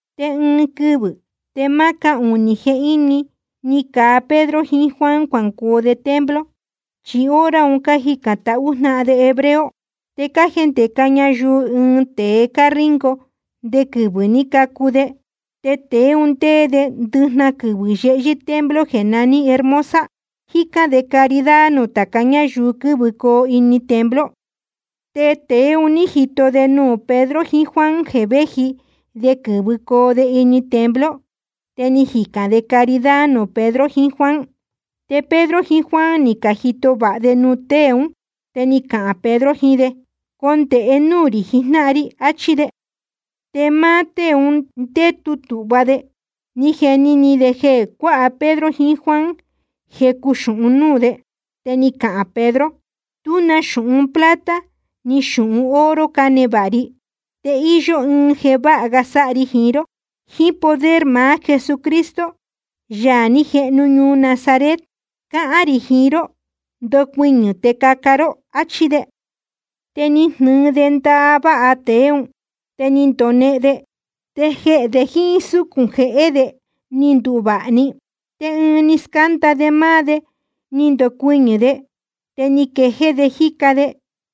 Te ɨɨn quɨvɨ̄ te máá cáhunī jehíni ni caa Pedro jiín Juan cuangoo de templo, chi hora un cájicān tahú jnáhan de hebreo. Te cájendēca ñayuu ɨɨn tēe cáríngo nde quɨvɨ̄ ní cacu de. Te tēe un ndéé de ndɨjnahan quɨvɨ̄ yehyɨ́ templo jeē naní Hermosa, jícán de caridad nuū tāca ñáyuu quɨ́vɨcoo ini templo. Te tēe un ní jito de nuū Pedro jiín Juan jeē véji de quɨ̄vɨcoo de ini templo, te ni jicān de caridad nuū Pedro jiín Juan. Te Pedro jiín Juan ni cajito vāha de nuū tée ún. Te ni cahān Pedro jiín de: Condēhe núū rī jijnáhan ri, achí de. Te máá tée un ndétu tūhva de, ni jeni ni de jeē cuáha Pedro jiín Juan jecu xūhun núū de. Te ni cahān Pedro: Tú na xūhun plata ni xūhun oro cánevāha ri. Te íyó ɨɨn jeē váha ga sáha ri jiín ró: jíín poder maá Jesucristo, Yaā ní jehnu ñuu Nazaret, cáhán rī jiín ró, ndocuɨñɨ̄ te caca ró, áchí de. Te ni jnɨɨ de ndaváha tēe ún, te ni ndonehen de. Te jehē de jíín súcūn jehé de ni nduvāha‑ni. Te ɨɨn ni scánda de máá de ni ndocuɨñɨ̄ de, te ni quejéé de jíca de.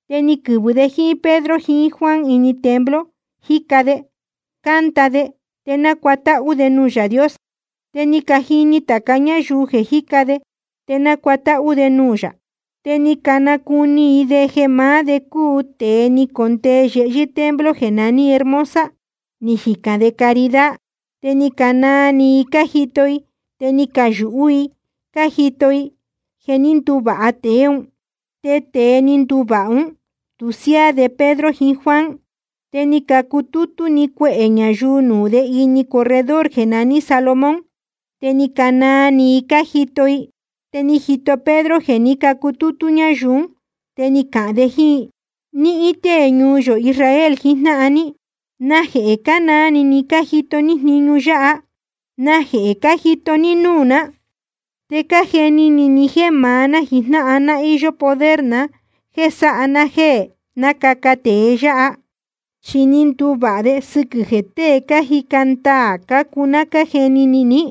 Te ni quɨ̄vɨ de jíín Pedro jiín Juan ini templo, jíca de, cánda de, te nácuatáhú de nuū Yaā Dios. Te ni cajini tāca ñáyuu jeē jíca de te nácuatáhú de nuū yā. Te ni canacuni i de jeē maá de cúu tēe ni condee yehyɨ́ templo jeē naní Hermosa, ni jicān de caridad. Te ni canaa ni i ni cajito i, te ni cayūhú i cájito i jeē ní nduvāha tēe ún. Te tēe ni nduvāha ún, tu siáá de Pedro jiín Juan. Te ni cacutútú‑ni cuehē ñayuu nuū de ini corredor jeē naní Salomón, te ni canaa ni i cájito i. Te ni jito Pedro jeē ní cutútú ñáyuu ún, te ni cahān de jíín i: Níhín tée ñuu yō Israel jijnáhan ní, ¿najehē cánaa ni ni cájito ní jniñu yáha? ¿Najehē cájito ní núū ná te cájeni ni ni jéē maá ná jijnáhan ná íyó poder na jéē sáha ná jéē nácaca tēe yáha? ¿Chí ní nduvāha de sɨquɨ̄ jeē tée cájica ndaā cácuu ná cájeni ni ní?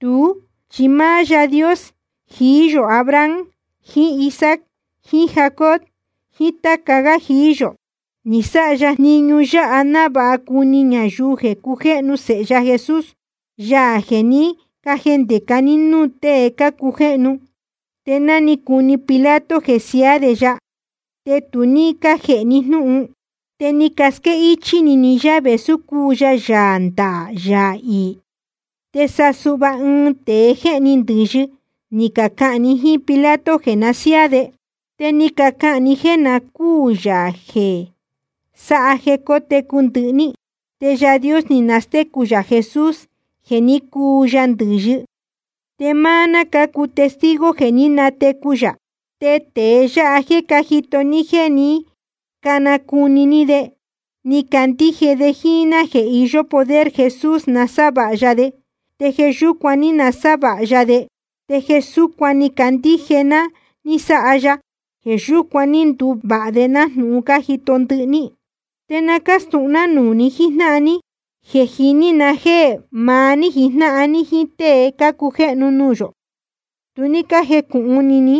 Tuú chi máá Yáā Dios jií yō Abraham jiín Isaac jiín Jacob jiín táca gá jií yō, ni sáha ya jniñu yáha návāha cuni ñayuu jeē cujéhnu Sēhe ya Jesús, Yaā jeē ní cajendēca ní núū tée cácujéhnu. Te ná ni cuni Pilato jeē siaá de ya, te tu ní cájēhe ni jnúhun. Te ni casquéhichī ni yá vēsú cúu ya Yaā ndaā, Yaā iī. Te sa suhva ɨɨn tēe jéhni ndɨ̄yɨ ni cacahān ni jíín Pilato jeē na siáá de. Te ni cacahān ni jéē na cúū Yaā jeē sáha jeē técu ndɨhɨ‑ni. Te Yaā Dios ni nastécu yā Jesús jeē ní cuu ya ndɨ̄yɨ, te máá ná cácuu testigo jeē ní natecu yā. Te tēe yáha jéē cájito ní te cánacuni ní de, ni candíje de jíín ná jeē iyó poder Jesús nasávāha ya de, te jeē yúcuan ní nasávāha ya de. Te jeē súcuan ni cacandíje ná ní sáha ya, jeē yúcuan ní nduvāha vāha de nájnūhun cájito ndɨhɨ ní. ’Te na cástūhun ná nuū ni jíjnáhan ní, je jíní na jéē maá ní jíjnáhan ní jíín tée cácujéhnu nuū yō, tu ní cájecūhun ni ní,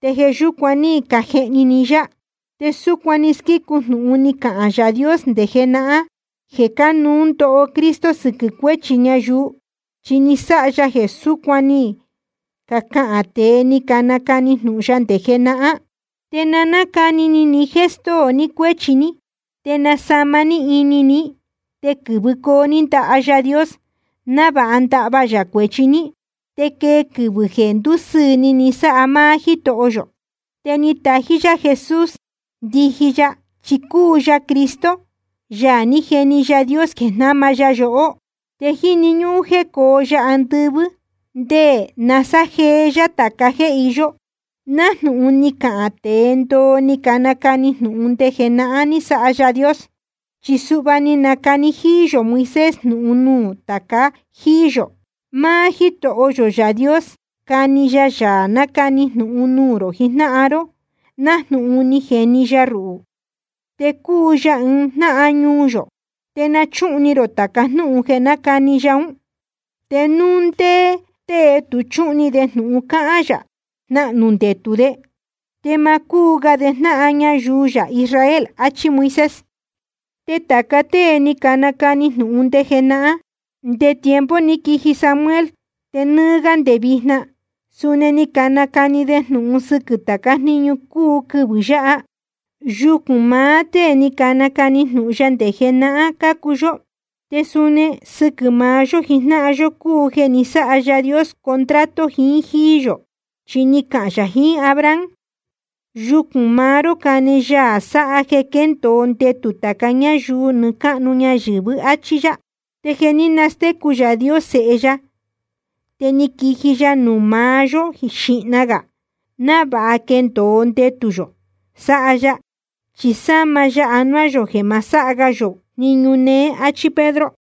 te jeē yúcuan ní cajehni ni yá. Te súcuan ni squícu jnūhun ni cahān Yaā Dios nde jenahán jéē cánuú ndoho Cristo sɨquɨ̄ cuéchi ñayuu, chi ni sáha ya jeē súcuan ni cacahān tēe ni canacani jnūhun ya nde jenahán. Te na nácani ni ni jéē stóo ni cuéchi ní, te nasāma ini ní, te quɨ̄vɨcoo ní ndaha Yaā Dios návāha ndahva yā cuēchi ní. Te quee quɨvɨ̄ jeē ndúsɨɨ̄ ni ni sáha máá Jítoho yō. Te natají yá Jesús ndiji ya, chi cúu ya Cristo, Yaā ní jeni Yaā Dios jeē jnáma ya yohó. Te jíni ñúhún jéē cóo ya andɨvɨ́ ndé nasájeé yá tāca jéē iyó, nájnūhun ni cacahān tēe ndoo ni canacani jnūhun nde jenahán ní sáha Yaā Dios. Chi suhva ni nacani jíí yō Moisés jnūhun nuū tāca jíí yō: Máá Jítoho yō Yaā Dios cani ya Yaā nacani jnūhun nuū rō jijnáhan ró, nájnūhun ni jeni ya ruhū. Te cuu ya ɨɨn jnáhan ñuu yō. Te na chúhun ni rō tāca jnúhun jeē nácani ya ún. Te núu ndé tée tú chuhun ni de jnūhun cahān yā, jnahnū ndetū de, te ma cúu ga de jnáhan ñayuu yā Israel, áchí Moisés. ’Te tāca tée ni canacani jnūhun nde jenahán, nde tiempo ni quiji Samuel te nɨ́ɨ́ gá nde vijna, suni ni canacani de jnūhun sɨquɨ̄ tācá jniñu cúu quɨvɨ̄ yáha. Yucūn maá tée ni canacani jnūhun ya nde jenahán cácuu yó, te suni sɨquɨ̄ maá yó jijnáhan yó cúu jeē ni sáha Yaā Dios contrato jiín jíí yō. Chi ni cahān yā jiín Abraham: Yucūn maá ró cane Yaā sáha jeē quéndōo ndetū tāca ñáyuu nɨɨ́ cáhnu ñayɨ̄vɨ, áchí yá. Te jeē ní nastécu Yaā Dios Sēhe ya, te ni quiji ya nuū maá yó xíhna gā, návāha quendōo ndetū yō sáha ya, chi sama ya anuá yō jeē ma sáha ga yō jniñu neé, áchí Pedro.